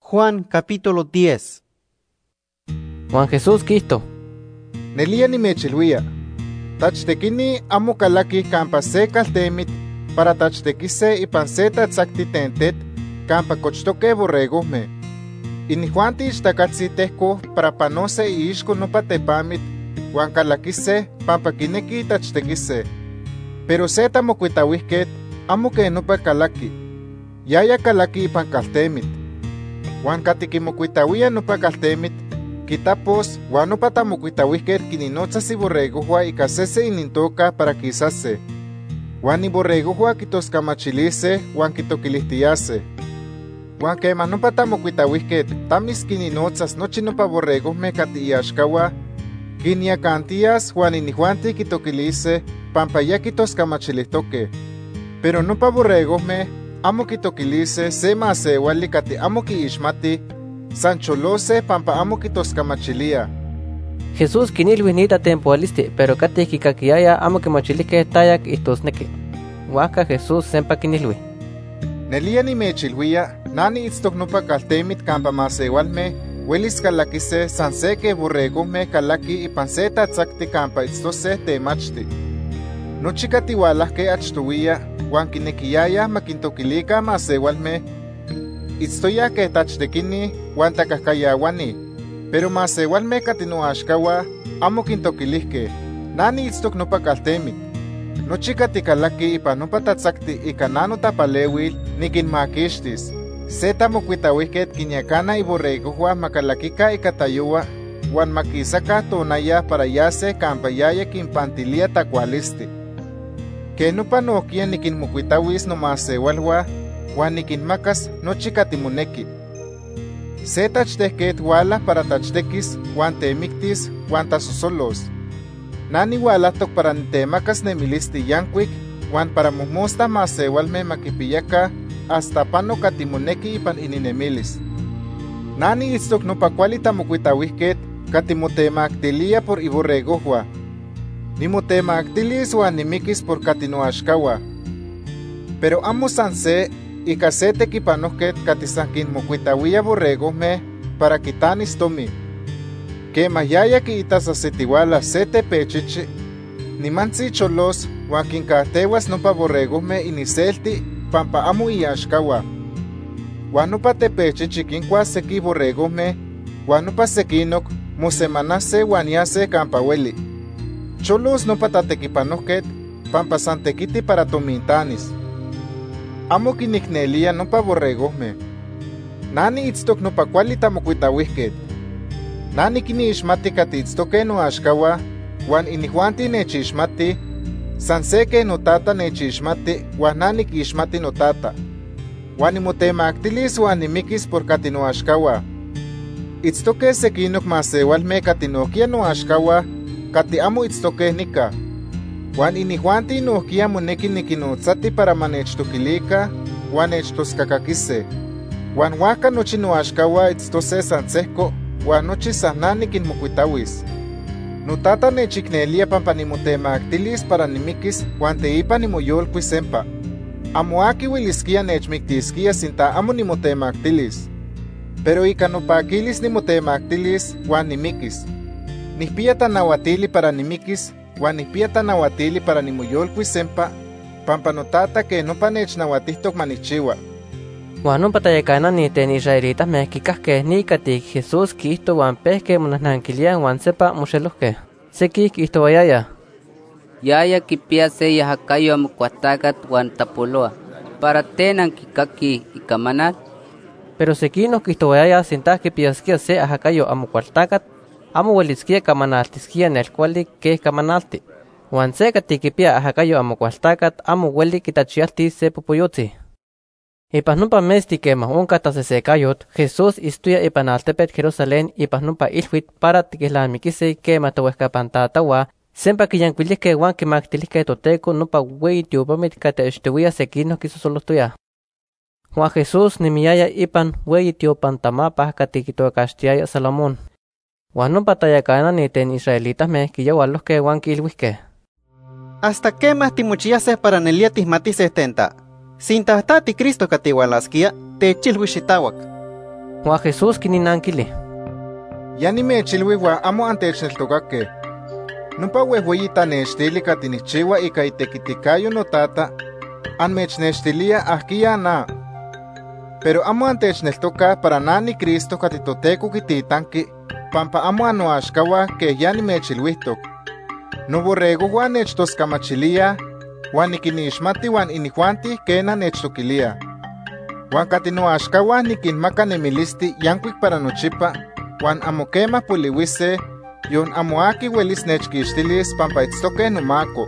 Huan Jesús quiijto: “Nelía nimechilhuía, tachtequini amo calaquij campa se caltemit para tachtequise ipan se tatzacti ten tet campa cochtoque borregojme. Inijuanti ixtacatzi tejcoj para panose iixco nopa tepamit huan calaquise pampa quinequij tachtequise. Pero se tamocuitahuijquet amo quej nopa calaqui. Yaya calaqui ipan caltemit. Huan cati quimocuitahuía nopa caltemit quitapos, huan nopa tamocuitahuijquet quinnotzas iborregojhua ica sese inintoca para quisase. Huan iborregojhua quitoscamachilise huan quitoquilijtiyase. Huan quema nopa tamocuitahuijquet tamis quinnotzas nochi nopa borregojme cati iaxcahua, quinyacantiyas huan inijuanti quitoquilise pampa ya quitoscamachilijtoque. Pero nopa borregojme amo quitoquilise se masehuali cati amo quiixmatij, san cholose pampa amo quitoscamachilíaj.” Jesús quinilhui ni tatenpohuilisti pero cati quicaquiyayaj amo quimachilijque taya quiijtosnequi. Huajca Jesús sempa quinilhui: “Nelía nimechilhuía na niitztoc nopa caltemit campa masehualme huelis calaquise san se quej borregojme calaquij ipan se tatzacti campa itztose temachti. Nochi cati hualajque achtohuiya huan quinequiyayaj ma quintoquilica masehualme, itztoyaj quej tachtequini huan tacajcayahuani, pero masehualme cati noaxcahua amo quintoquilijque. Na niitztoc nopa caltemit. Nochi cati calaquij ipan nopa tatzacti ica na notapalehuil, niquinmaquixtis. Se tamocuitahuijquet quinyacana iborregojhua ma calaquica ica tayohua huan ma quisaca tonaya para yase campa yaya quinpantilía tacualisti. Quej nopa nojquiya niquinmocuitahuis nomasehualhua huan niquinmacas nochi cati monequi. “Se tachtejquet huala para tachtequis huan temictis huan tasosolos. Na nihualajtoc para nitemacas nemilisti yancuic huan para mojmosta masehualme ma quipiyaca hasta pano cati monequi ipan ininemilis. Na niitztoc nopa cuali tamocuitahuijquet cati motemactilía por iborregojhua. Nimotemactilis huan nimiquis por cati noaxcahua. Pero amo san se ica se tequipanojquet cati san quinmocuitahuía borregojme para quitanis tomi. Quema yaya quiitas ajsitihuala se tepechichi, nimantzi cholos huan quincajtehuas nopa borregojme iniselti pampa amo iaxcahua. Huan nopa tepechichi quincuas sequij borregojme huan nopa sequinoc mosemanase huan yase campa hueli. Cholos nopa tatequipanojquet pampa san tequiti para tomintanis. Amo quinicnelía nopa borregojme. “Na niitztoc nopa cuali tamocuitahuijquet. Na niquinixmati cati itztoque noaxcahua huan inijuanti nechixmatij, san se quej noTata nechixmati huan na niquixmati noTata. Huan nimotemactilis huan nimiquis por cati noaxcahua. Itztoque sequinoc masehualme cati nojquiya noaxcahua cati amo itztoque nica. Huan inijuanti nojquiya monequi niquinnotzati para ma nechtoquilica huan nechtoscacaquise. Huan huajca nochi noaxcahua itztose san sejco huan nochi san na niquinmocuitahuis. “NoTata nechicnelía pampa nimotemactilis para nimiquis huan teipa nimoyolcuis sempa. Amo aqui huelisquía nechmictisquía sinta amo nimotemactilis. Pero ica nopaquilis nimotemactilis huan nimiquis. Nijpiya tanahuatili para nimiquis huan nijpiya tanahuatili para nimoyolcuis sempa pampa noTata quej nopa nechnahuatijtoc ma nijchihua.” Huan nopa tayacanani ten israelitame quicajque ni cati Jesús quiijto huan pejque monajnanquilíaj huan sempa moxelojque. Sequij quiijtohuayayaj: ―Yaya quipiya se iajacayo Amocualtacat huan tapolohua. ¿Para ten anquicaquij icamanal? Pero sequinoc quiijtohuayayaj sinta quipiyasquía se iajacayo Amocualtacat, amo huelisquía camanaltisquía nelcuali quej camanalti. Huan se cati quipiya iajacayo Amocualtacat amo hueli quitachiyaltis se popoyotzi. Ipan nopa metzti quema onca tasesecayot, Jesús itztoya ipan altepet Jerusalén ipan nopa ilhuit para tiquelnamiquise quema tohuejcapan tatahua sempa quiyancuilijque huan quimactilijque Toteco nopa hueyi tiopamit cati achtohuiya sequinoc quisosolojtoyaj. Huan Jesús nemiyaya ipan hueyi tiopan tamapa cati quitocaxtiyayaj Salomón. Huan nopa tayacanani ten israelitame quiyahualojque huan quiilhuijque: ―¿Hasta quema timochiyase para nelía tijmatise ten ta? Sinta ta tiCristo cati hualasquía, techilhui xitahuac. Huan Jesús quinnanquili: ―Ya nimechilhui huan amo antechneltocaque. Nopa huejhueyi tanextili cati nijchihua ica itequiticayo noTata amechnextilía ajquiya na. Pero amo antechneltocaj para na niCristo cati Toteco quititanqui pampa amo annoaxcahua quej ya nimechilhuijtoc. Noborregojhua nechtoscamachilíaj huan niquinixmati huan inijuanti, quena, nechtoquilíaj. Huan cati noaxcahua niquinmaca nemilisti yancuic para nochipa huan amo quema polihuise; yon amo aqui huelis nechquixtilis pampa itztoque nomaco.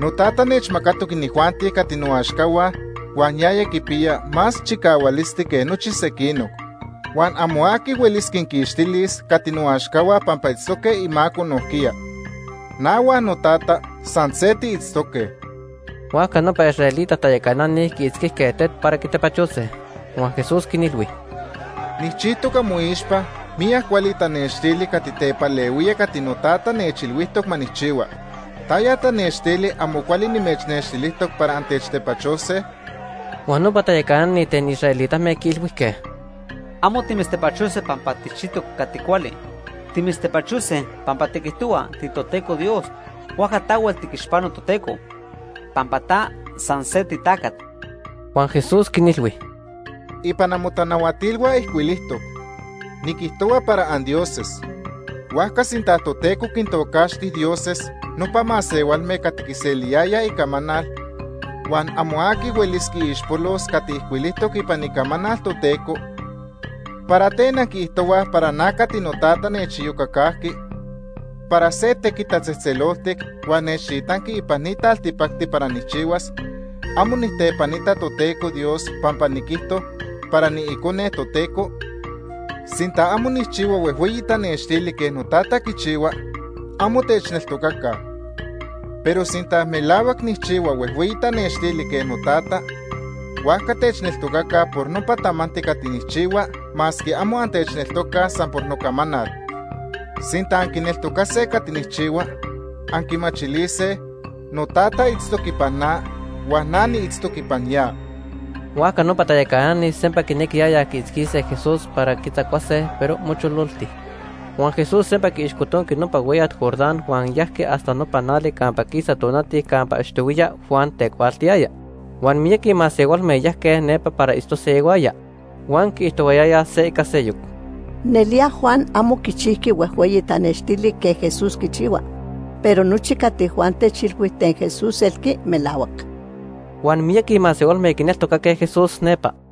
NoTata nechmacatoc inijuanti cati noaxcahua huan yaya quipiya más chicahualisti que nochi sequinoc. Huan amo aqui huelis quiquixtilis cati noaxcahua pampa itztoque imaco nojquiya. Na huan noTata san se tiitztoque. Huajca nopa israelita tayacanani quiitzquijque tet para quitepachose. Huan Jesús quinilhui: ―Nijchijtoc amoixpa miyac cuali tanextili cati tepalehuía cati noTata nechilhuijtoc ma nijchihua. ¿Taya tanextili amo cuali nimechnextilijtoc para antechtepachose? Huan nopa tayacanani ten israelitame quiilhuijque: ―Amo timitztepachose pampa tijchijtoc cati cuali. Timitztepachose pampa tiquijtohua tiToteco Dios. Huajca tahuel tiquixpano Toteco, pampa ta san se titacat. Huan Jesús quinilhui: ―Ipan amotanahuatilhua ijcuilijtoc: ‘Niquijtohua para andioses.’ Huajca sinta Toteco quintocaxti ‘dioses’ nopa masehualme cati quiseliyayaj icamanal, huan amo aqui huelis quiixpolos cati ijcuilijtoc ipan Icamanal Toteco, ¿para ten anquiijtohuaj para na cati noTata nechiyocacajqui para se tequit tatzejtzeloltic huan nechtitanqui ipan ni taltipacti para nijchihuas, amo nijtepanita Toteco Dios pampa niquijto para niIcone Toteco? Sinta amo nijchihua huejhueyi tanextili quej noTata quichihua, amo techneltocaca. Pero sinta melahuac nijchihua huejhueyi tanextili quej noTata, huajca techneltocaca por nopa tamanti cati nijchihua masque amo antechneltocaj san por nocamanal. Sinta anquineltocase cati nijchihua, anquimachilise noTata itztoc ipan na huan na niitztoc ipan ya. Huajca nopa tayacanani sempa quinequiyayaj quiitzquise Jesús para quitzacuase, pero mochololti. Huan Jesús sempa quiixcotonqui nopa hueyat Jordán huan yajqui hasta nopa nali campa quisa tonati campa achtohuiya Juan tecuaaltiyaya. Huan miyaqui masehualme yajque nepa para itztose ihuaya. Huan quiijtohuayayaj se ica seyoc: ―Nelía Juan amo quichijqui huejhueyi tanextili quej Jesús quichihua, pero nochi cati Juan techilhui ten Jesús elqui melahuac. Huan miyaqui masehualme quineltocaque Jesús nepa.